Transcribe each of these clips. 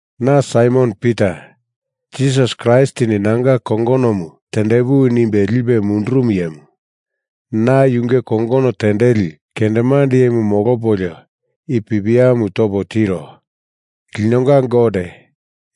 Na Saimon Pita, Jisas Kraistini nanga kongonomu tendepuwi nimbe lipe mundurumu iyemu, na yunge kongono tendeli kendemande iyemu molopolio i pipiamu topo tiro. Linonga Gote,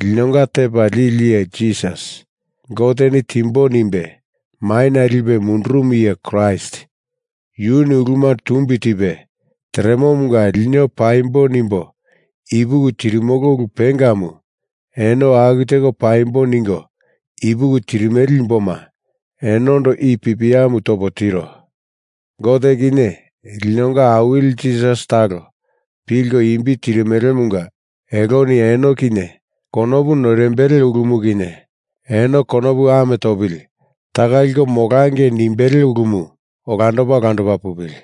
linonga Tepa Lili Iye Jisas, Goteni timbo nimbe maina lipe mundurumu iye Kraist, yuni uluma tumbi tipe teremomunga lino paimbo nimbo ipuki tirimolo ulu pengamu eno aku teko paimbo ningo ipuki tirimele imboma, enondo i pipiamu topo tiro. Gote kinye linonga Awili Jisas talo pilko imbi tirimelemunga eloni eno kinye konopu noirimbele ulumu kinye, eno konopu ame topili taka liko molangei nimbele ulumu olandopa olandopa pupili.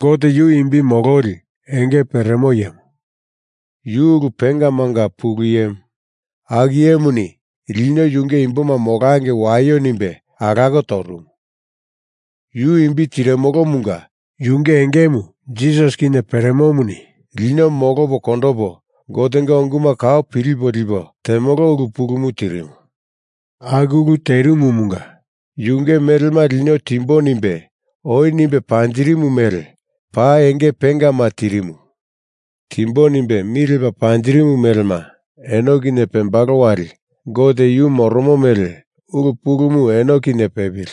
Gote yu imbi mololi enge peremo iyemu. Yu ulu pengamanga pulu iyemu. Aku iyemuni lino yunge imboma molangei waio nimbe alako torumu. Yu imbi tirimolomunga yunge engemu Jisasi kinye peremomuni lino molopo kondopo Gotenga unguma kau pilipo lipo temolo ulu pulumu tirimu. Aku ulu terimumunga yunge melema lino timbo nimbe oi nimbe panjirimu mele paa enge pengama tirimu. Timbo nimbe mi lepa panjirimu melema eno kinye pembalo wali Gote yu moromo mele ulu pulumu eno kinye pepili,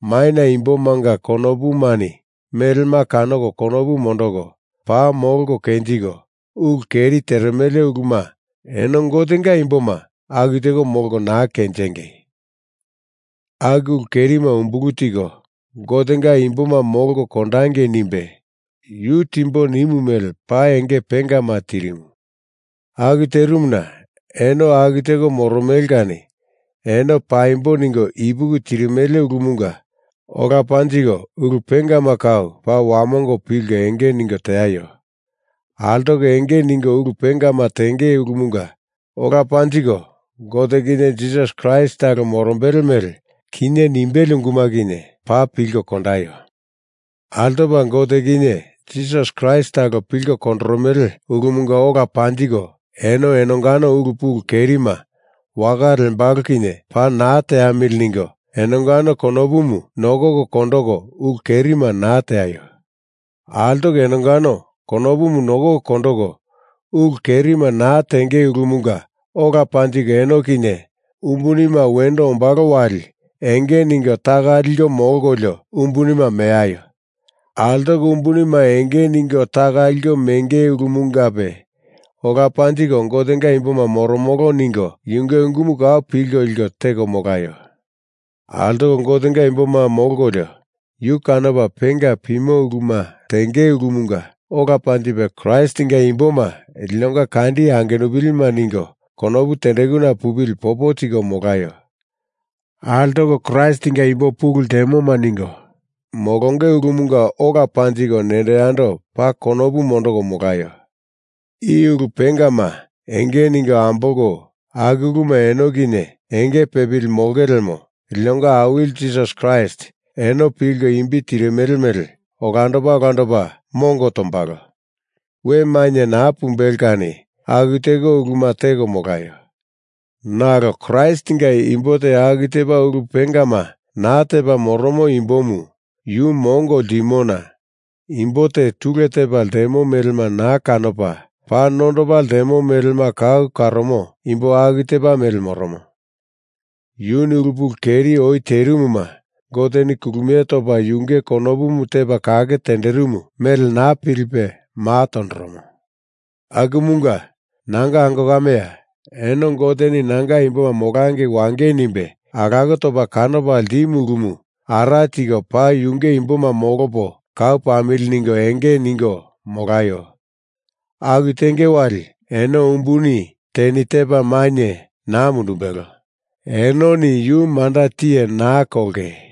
maina imbomanga konopumani melema kanoko konopu mondoko paa molko kenjiko, ulu keri teremele uluma eno Gotenga imboma aku teko molko naa kenjingei! Aku ulu kerima umbulu tiko, Gotenga imboma molko kondangei nimbe, yu timbo nimu mele paa enge pengama tirimu. Aku terimuna eno aku teko moromele kani eno paimbo ningo ipuki tirimele ulumunga ola panjiko ulu pengama kau paa wamongo pilko enge ningo teaio. Altoko enge ningo ulu pengama tenge ulumunga ola panjiko Gote kinye Jisas Kraist talo morombele mele kinye nimbele unguma kinye paa pilko kondaio. Altopa Gote kinye Jisas Kraist talo pilko kondoromele ulumunga ola panjiko eno enongano ulu pulu kerima waka lembalo kinye paa naa teamili ningo enongano konopumu nokoko kondoko ulu kerima naa teaio. Altoko enongano konopumu nokoko kondoko ulu kerima naa tenge ulumunga ola panjiko eno kinye umbunima wendo ombalo wali enge ningo taka liko molkolio umbunima meaio. Altoko umbunima enge ningo taka liko menge ulumungape ola panjiko Gotenga imboma moromolo ningo yunge unguma kau pilko liko teko molaio. Altoko Gotenga imboma molkolio Yu kanopa penga pimo uluma tenge ulumunga ola panjiko Kraistinga imboma linonga kandi angenupilima ningo konopu tendekuna pupili popo tiko molaio. Altoko Kraistinga imbo pulu ltemoma ningo molonge ulumunga ola panjiko nendo yando paa konopu mondoko molaio. I ulu pengama enge ningo ambolko aku uluma eno kinye enge pepili molonge lemo, linonga Awili Jisas Kraist eno pilko imbi tirimele mele olandopa olandopa mongo tombalo. We mainye naa pumbelo kani aku teko uluma teko molaio. Nalo Kraistinga imbo te aku tepa ulu pengama naa tepa moromo imbomu yu mongo ltimona imbo te tule tepa ltemo melema naa kanopa, paa nondopa ltemo melema kau karomo imbo aku tepa mele moromo. Yuni ulu pulu keri oi terimuma Goteni kulumie topa yunge konopu tepa kake tenderimu mele naa pilipe maa tondoromo. Akumunga, nanga ango kameya, eno Goteni nanga imboma molangei wangei nimbe alako topa kanopa ltimu ulumu ara tiko paa yunge imboma molopo kau pamili ningo enge ningo molaio. Aku tenge wali eno umbuni teni tepa mainye naa mundumbelo, enoni yu manda tiye naa kolonge.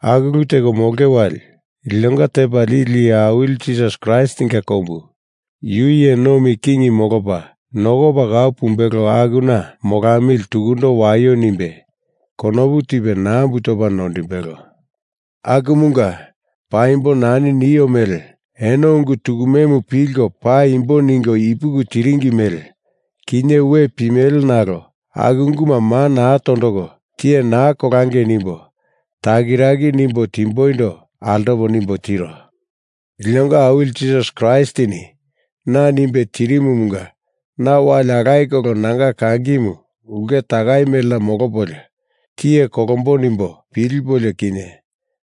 Aku ulu teko molonge wali, linonga Tepa Lili Iye Awili Jisas Kraistinga kombu, Yu iye nomi king molopa nokopa kau pumbelo akuna molamili tukundo waio nimbe konopu tipe nambu topa noindimbelo. Akumunga, paimbo nani nio mele eno ungu tukumemu pilko paa paimbo ningo ipuki tiringi mele, kinye we pimele nalo aku unguma maa naa tondoko tiye naa kolangei nimbo takiraki nimbo timboindo altopo nimbo tiro. Linonga Awili Jisas Kraistini na nimbe tirimumunga na wali alaye kolo nanga kangimu ulke takai melena molopolio, tiye kolombo nimbo pilipolio kinye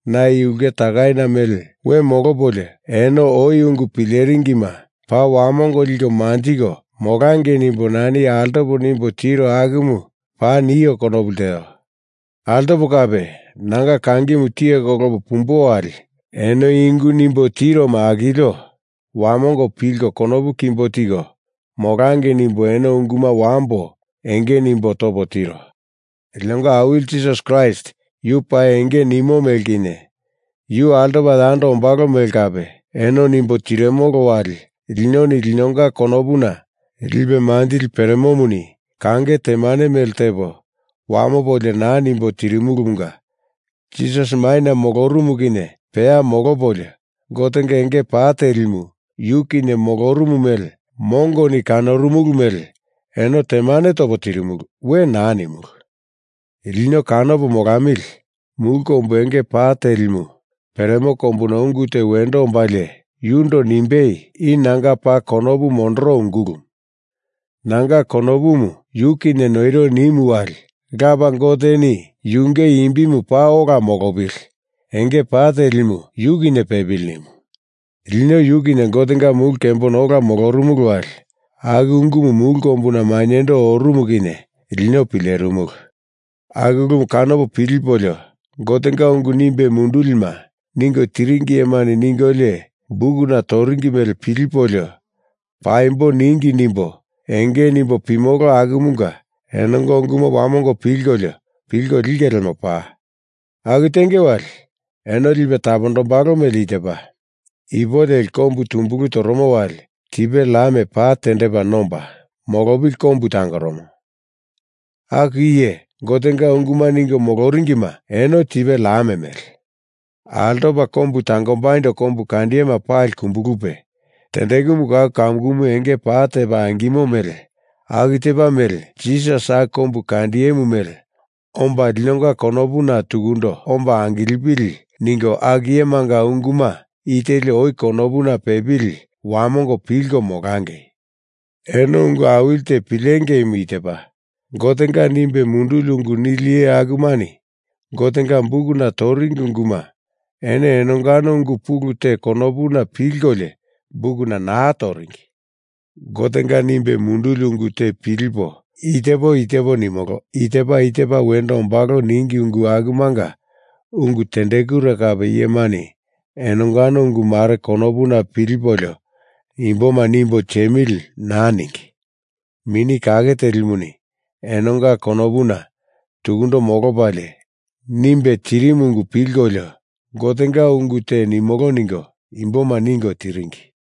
na i ulke takaina mele we molopolio eno oi ungu pileringima paa wamongo liko manjiko molangei nimbo nani altopo nimbo tiro akumu paa nio konopu lteo. Altopo kape, nanga kangimu tiye kolopo pumbo wali eno i ungu nimbo tiroma akilio wamongo pilko konopu kimbo tiko molangei nimbo eno unguma wambo enge nimbo topo tiro. Linonga Awili Jisas Kraist yu paa enge nimo mele kinye, Yu altopa yando ombalo mele kape, eno nimbo tirimolo wali linoni linonga konopuna lipe manjili peremomuni kange temanema mele tepo wamopolio naa nimbo tirimulumunga Jisas maina molorumu kinye peya molopolio, Gotenga enge pa telimu Yu kinye molorumu mele mongoni kanorumulu mele eno temane topo tirimulu. We naa nimulu. Lino kanopo molamili mulu kombu enge pa telimu peremo kombuna ungu te wendo ombalie yundo nimbei i nanga paa konopu mondoro ungulumu. Nanga konopumu Yu noiro nimu wali Lapa Goteni Yunge imbimu paa ola molopili, enge pa telimu yu kinye pepili nimu. Lino yu kinye Gotenga mulu kembona ola molorumulu wali aku ungumu mulu kombuna mainyendo orumu kinye lino pilerimulu. Aku ulumu kanopo pilipolio, Gotenga ungu nimbe mundulima ningo tiringi iyemani ningolio bukuna toringi mele pilipolio paimbo ningi nimbo enge nimbo pimolo akumunga enonga unguma wamongo pilkolio pilko linge lemo paa. Aku tenge wali eno lipe tapondombalo mele i tepa: Ipu leli kombu tumbulu toromo wali tipe lam pa tendepa nomba molopili kombu tangoromo. Aku iye Gotenga unguma ningo moloringima eno tipe lam mele. Altopa kombu tangombaindo kombukandiyema pali kumbulupe, tendekumu kau kamukumu enge pa tepa angimo mele aku tepa mele Jisas aku kombukandiyemu mele omba linonga konopuna tukundo omba angilepili ningo aku iyemanga unguma i teli oi konopuna pepili wamongo pilko molangei. Eno ungu awili te pilengeimu i tepa: Gotenga nimbe munduli ungu nili iye akumani Gotenga bukuna toringi unguma eno enongano ungu pulu te konopuna pilkolio bukuna naa toringi. Gotenga nimbe munduli ungu te pilipo i tepo i tepo nimolo, i tepa i tepa wendo ombalo ningi ungu akumanga ungu tendekure kape iyemani enongano ungu mare konopuna pilipolio imboma nimbo tiemili naa ningi. Mini Kake Telimuni enonga konopuna tukundo molopalie nimbe tirimu ungu pilkolio Gotenga ungu te nimolo ningo imboma ningo tiringi.